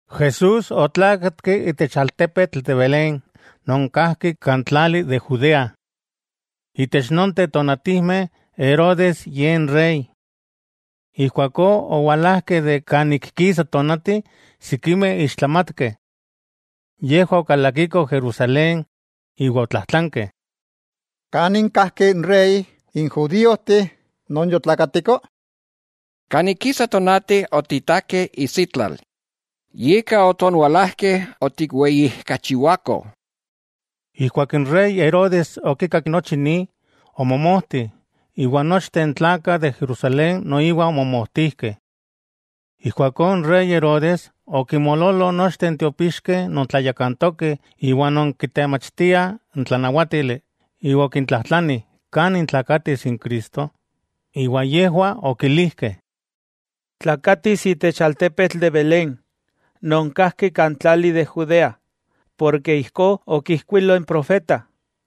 Jesús otlákatki itech altepetl de Belén non kajki kan tlali de Judea. Itech nonteh tonatijmeh Herodes ye n rey. Ijkuakó owalajkeh kan ik kisa tonati sikimeh ixtlamatkeh. Yejwah okalakikoh Jerusalén, iwa otlajtlankeh: —¿Kanin kajki inrey n judíojteh non yotlakatiko? Kan ik kisa tonati otiktakeh isitlal, yika otonwalajkeh otikweyijkachiwakoh. Ijkuak n rey Herodes okikak nochi ni, omomojti, iwa nochteh n tlakah de Jerusalén noiwa omomojtijkeh. Ijkuakó n rey Herodes okinmoololo nochteh n tiopixkeh non tlayakantokeh iwa non kitemachtiah n tlanawátili, iwa okintlajtlani kani tlakatis n Cristo. Iwa yejwah okilijkeh: —Tlakatis itech altepetl de Belén, non kajki kan tlali de Judea, ijkó okijkuilo n profeta: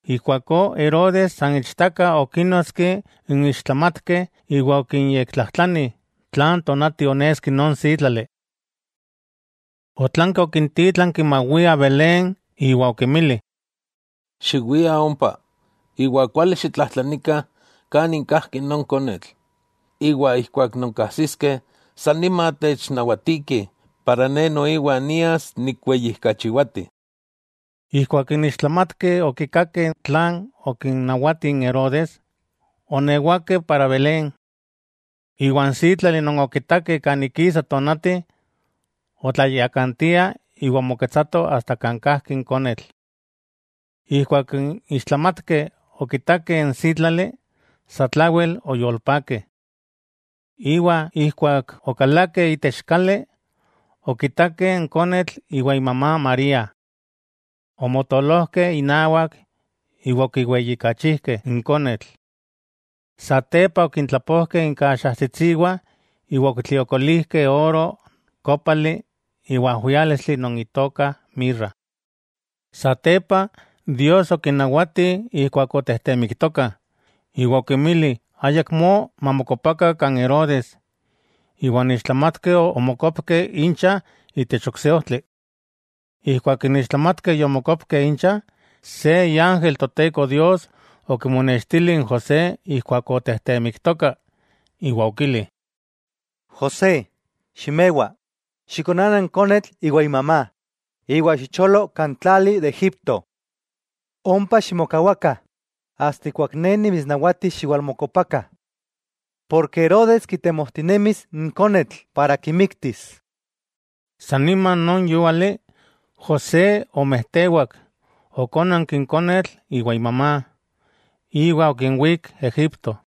Ijkuakó Herodes san ichtaka okínnotski n ixtlamatkeh, iwa okinyektlajtlani tlan tonati oneski non sítlali. Otlanki okintítlanki mawiah Belén, iwa okinmili: —Xiwiah ompa, iwa xiyektlajtlanikah kanin kajki non konetl, iwa ijkuak nonkajsiskeh, sanima technawatikih ne noiwa nias nikweyijkachiwati. Ijkuak n ixtlamatkeh okikakeh tlan okinnawati n Herodes, oonewakeh Belén. Iwa n sítlali non okitakeh kan ik kisa tonati, otlayakantia iwa omoketsato kan kajki n konetl. Ijkuak n ixtlamatkeh okitakeh n sítlali, satlawel oyolpakeh. Iwa ijkuak okalakeh itech kali, okitakeh n konetl iwan imamá María. Omotolojkeh inawak iwa okiweyijkachijkeh n konetl. Satepa okintlapojkeh inkaxajtsitsiwah iwa okitliokolijkeh oro, kópali iwa ajwiálistli non itoka mirra. Satepa, Dios okinnawatih ijkuak otejtemiktokah, iwa okinmili ayakmó mamokopakah kan Herodes, iwa n ixtlamatkeh omokopkeh incha itech ok se ojtli. Ijkuak n ixtlamatkeh yomokopkeh incha, se iángel Toteko Dios okimonextili n José ijkuak otejtemiktoka, iwa okili: —José, ximewa, xikonana n konetl iwa imamá, iwa xicholo kan tlali de Egipto. Ompa ximokawakah asta ijkuak ne nimitsnawatis xiwalmokopakah. Herodes kitemojtinemis n konetl para kimiktis. San nima non yúali, José omejtewak, okónanki n konetl iwa imamá, iwa okinwík Egipto.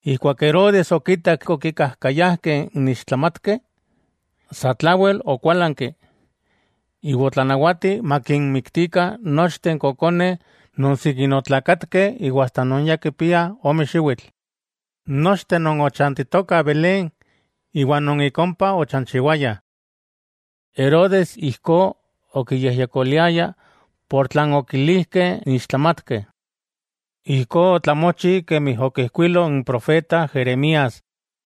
Ijkuak Herodes okitak okikajkayajkeh n ixtlamatkeh, satlawel okuálanki, iwa otlanawati makinmiktikah nochteh n kokoneh non sikin otlakatkeh iwa asta non ya kipiah ome xiwitl, nochteh non ochantitokah Belén iwa non ik ompa ochanchiwayah. Herodes ijkó okiyejyekoliaya ika tlan okilijkeh n ixtlamatkeh. Ijkó otlamochi kemi okijkuilo n profeta Jeremías: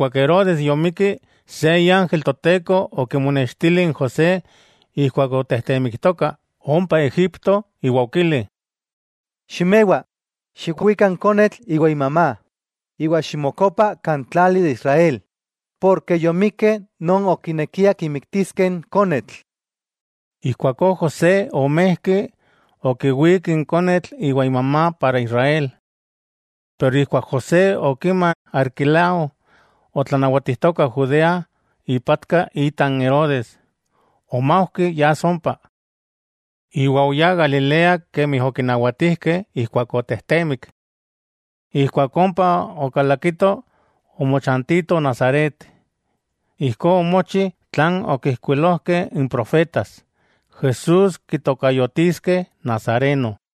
Ijkuak Herodes yomikki, se iángel Toteko okimonextili n José ijkuak otejtemiktoka ompa Egipto iwa okili: —Ximewa, xikwika n konetl iwa imamá, iwa ximokopa kan tlali de Israel, porke yomikeh non okinekiah kimiktiskeh n konetl. Ijkuakó José omejki, okiwík n konetl iwa imamá para Israel. Ijkuak José okima Arquelao otlanawatijtoka Judea ipatka ita n Herodes, omaujki yas ompa. Iwa oyá Galilea kemi okinawatijkeh ijkuak otejtemik. Ijkuak ompa okalakitoh, omochantitoh Nazaret. Ijkó omochi tlan okijkuilojkeh n profetas, Jesús kitokayotiskeh Nazareno.